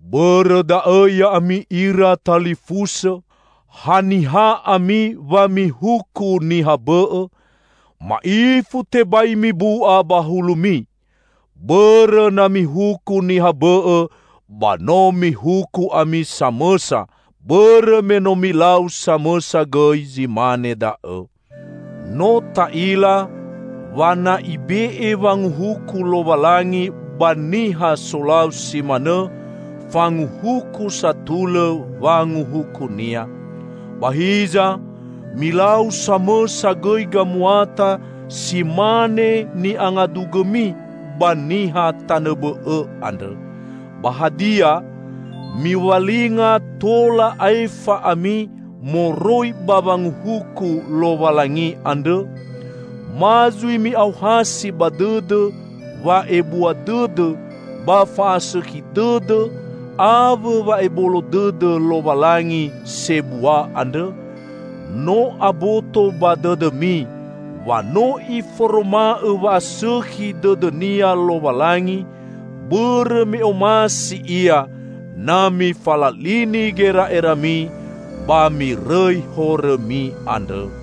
Bõrõ da'õ ya'ami ira talifusõ, haniha ami wa mihuku niha bõ'õ? Ma'ifu tebai mibu'a ba hulumi! Bõrõ na mihuku niha bõ'õ ba no mihuku ami samõsa, bõrõ me no milau samõsa gõi zi mane da'õ. No ta'ila wa na Ibe'e wanguhuku Lowalangi ba niha solau si manõ, fanguhuku satulõ wanguhuku-Nia. Ba hiza, milau samõsa gõi gamuata si mane ni'angadugõmi ba niha tanõ bõ'õ andrõ! Ba hadia, miwalinga tola aefa ami moroi ba wanguhuku Lowalangi andrõ? Ma zui mi'aohasi ba dõdõ wa'ebua dõdõ ba fa'asõkhi dõdõ awõ wa'ebolo dõdõ Lowalangi sebua andrõ? No aboto ba dõdõmi wa no Iforoma'õ wa'asõkhi dõdõ-Nia Lowalangi bõrõ me omasi Ia na mifalalini gera'erami ba mirõi horõmi andrõ.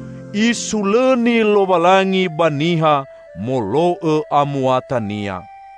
Isulõni Lowalangi ba niha molo'õ amuatania.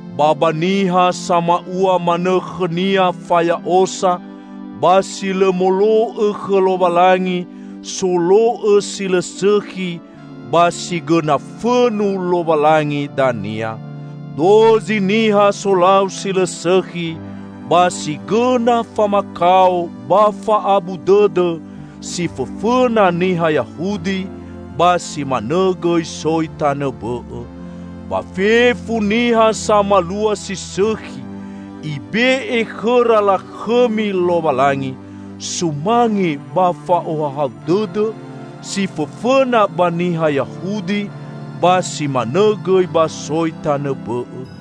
Ba ba niha sama'ua manõ khõnia faya'osa ba si lõ molo'õ khõ Lowalangi, solo'õ si lõ sõkhi, ba si gõna fõnu Lowalangi dania. Dozi niha solau si lõ sõkhi ba si gõna famakao ba fa'abu dõdõ; si fõfõna niha Yahudi, ba si manõ gõi soi tanõ bõ'õ. Ba fefu niha samalua si sõkhi Ibe'e khõra lakhõmi Lowalangi, sumange ba fa'ohahau dõdõ; si fõfõna ba niha Yahudi, ba si manõ gõi ba soi tanõ bõ'õ.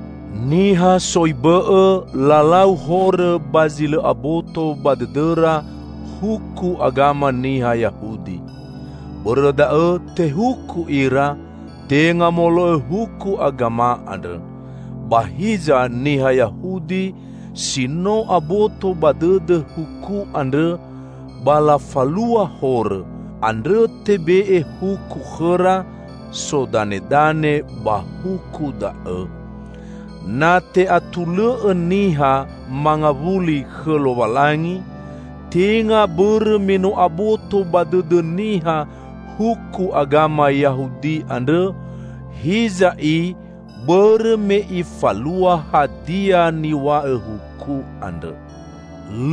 Niha soi bõ'õ, lalau horõ ba zi lõ aboto ba dõdõra huku agama niha Yahudi. Bõrõ da'õ, tehuku ira, tenga molo'õ huku agama andrõ. Ba hiza niha Yahudi si no aboto ba dõdõ huku andrõ ba lafalua horõ; andrõ tebe'e huku khõra sodanedane ba huku da'õ. Na te'atulõ'õ niha mangawuli khõ Lowalangi, tenga bõrõ me no aboto ba dõdõ niha huku agama Yahudi andrõ, hiza i bõrõ me ifalua hadia niw̃a'õ huku andrõ.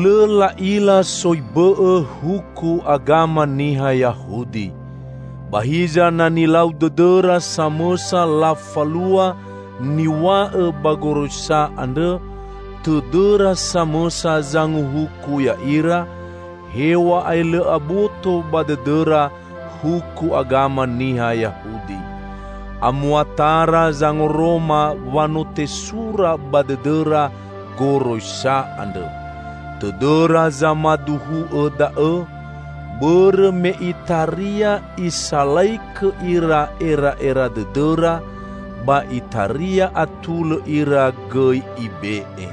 Lõ la'ila soi bõ'õ huku agama niha Yahudi. Ba hiza na nilau dõdõra samõsa lafalua niw̃a'õ ba goroisa andrõ, tõdõra samõsa zanguhuku ya'ira, hew̃a'ae lõ aboto ba dõdõra huku agama niha Yahudi. Amuatara zangoroma wa no tesura ba dõdõra goroisa andrõ. Tõdõra zamaduhu'õ da'õ; bõrõ me itaria isalaikõ ira era'era dõdõra ba itaria atulõ ira gõi ibe'e.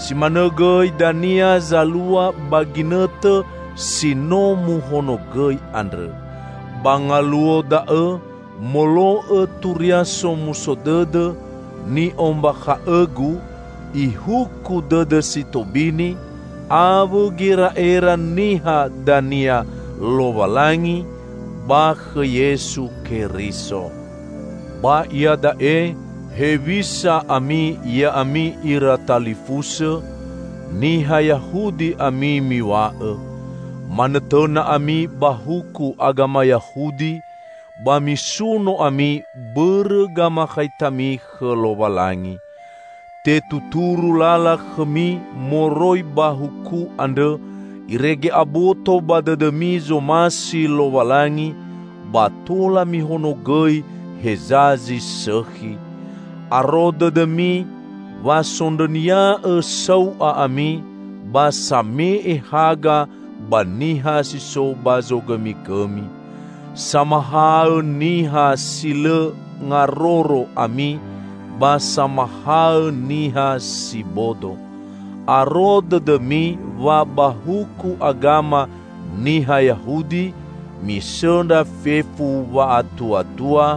Si manõ gõi dania zalua ba ginõtõ si no muhonogõi andrõ. Ba ngaluo da'õ -- molo'õ Turia Somuso Dõdõ ni'ombakha'õgu -- Ihuku dõdõ si tobini awõ gera'era niha dania Lowalangi ba khõ Yesu Keriso. Ba iada'e hewisa ami ya'ami ira talifusõ? Niha Yahudi ami miw̃a'õ. Manõtõna ami ba huku agama Yahudi ba misuno ami bõrõ gamakhaitami khõ Lowalangi. Tetuturu lala khõmi moroi ba huku andrõ irege aboto ba dõdõmi zomasi Lowalangi ba tola mihonogõi heza zi sõkhi. Aro dõdõmi wa sondrõnia'õ sau'a ami ba same'e haga ba niha si so ba zogõmigõmi. Samahaõ niha si lõ ngaroro ami ba samahaõ niha si bodo. Aro dõdõmi wa ba huku agama niha Yahudi misõndra fefu wa'atuatua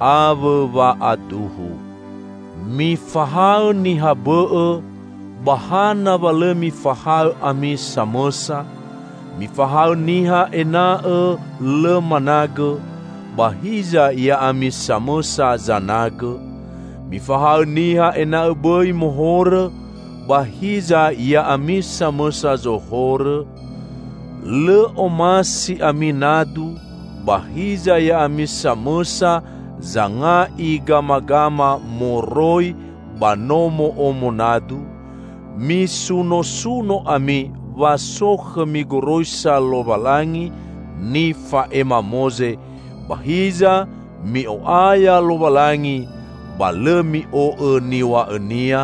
awõ wa'aduhu. Mifahaõ niha bõ'õ; ba hana wa lõ mifahaõ ami samõsa? Mifahaõ niha ena'õ lõ managõ, ba hiza ya'ami samõsa zanagõ? Mifahaõ niha ena'õ bõi mohorõ, ba hiza ya'ami samõsa zorohõ? Lõ omasi ami nadu, ba hiza ya'ami samõsa zanga'i gamagama moroi ba nomo'omo nadu? Misunosuno ami wa so khõmi goroisa Lowalangi nifa'ema Moze, ba hiza mi'o'aya Lowalangi ba lõ mi'o'õ niw̃a'õ-Nia?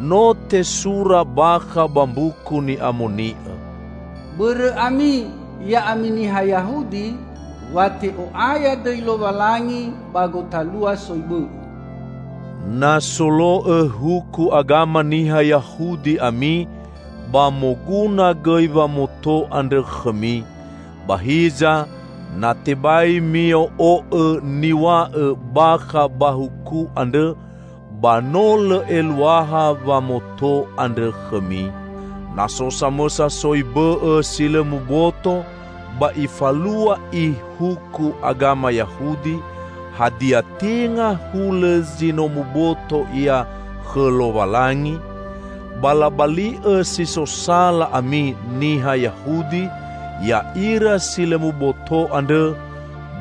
No tesura bakha ba Mbuku Ni'amoni'õ, "Bõrõ ami, ya'ami niha Yahudi, wa te'o'aya dõi Lowalangi ba gotalua soi bõ'õ." Na solo'õ huku agama niha Yahudi ami, ba moguna gõi wamoto andrõ khõmi. Ba hiza, na tebai mio'o'õ niw̃a'õ bakha ba huku andrõ, ba no lõ eluaha wamoto andrõ khõmi. Na so samõsa soi bõ'õ si lõ muboto, ba ifalua i huku agama Yahudi, hadia tenga hulõ zi no muboto ia khõ Lowalangi? Ba labali'õ si so sala ami niha Yahudi ya'ira si lõ muboto andrõ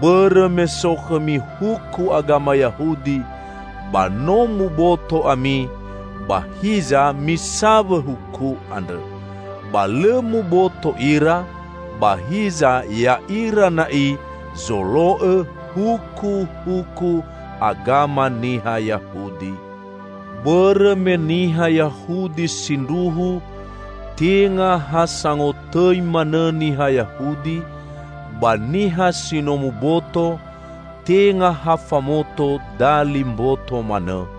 bõrõ me so khõmi huku agama Yahudi, ba no muboto ami, ba hiza misawõ huku andrõ. Ba lõ muboto ira, ba hiza ya'ira na'i zolo'õ hukuhuku agama niha Yahudi. Bõrõ me niha Yahudi sindruhu tenga ha sangotõi manõ niha Yahudi; ba niha si no muboto tenga ha famoto dali mboto manõ.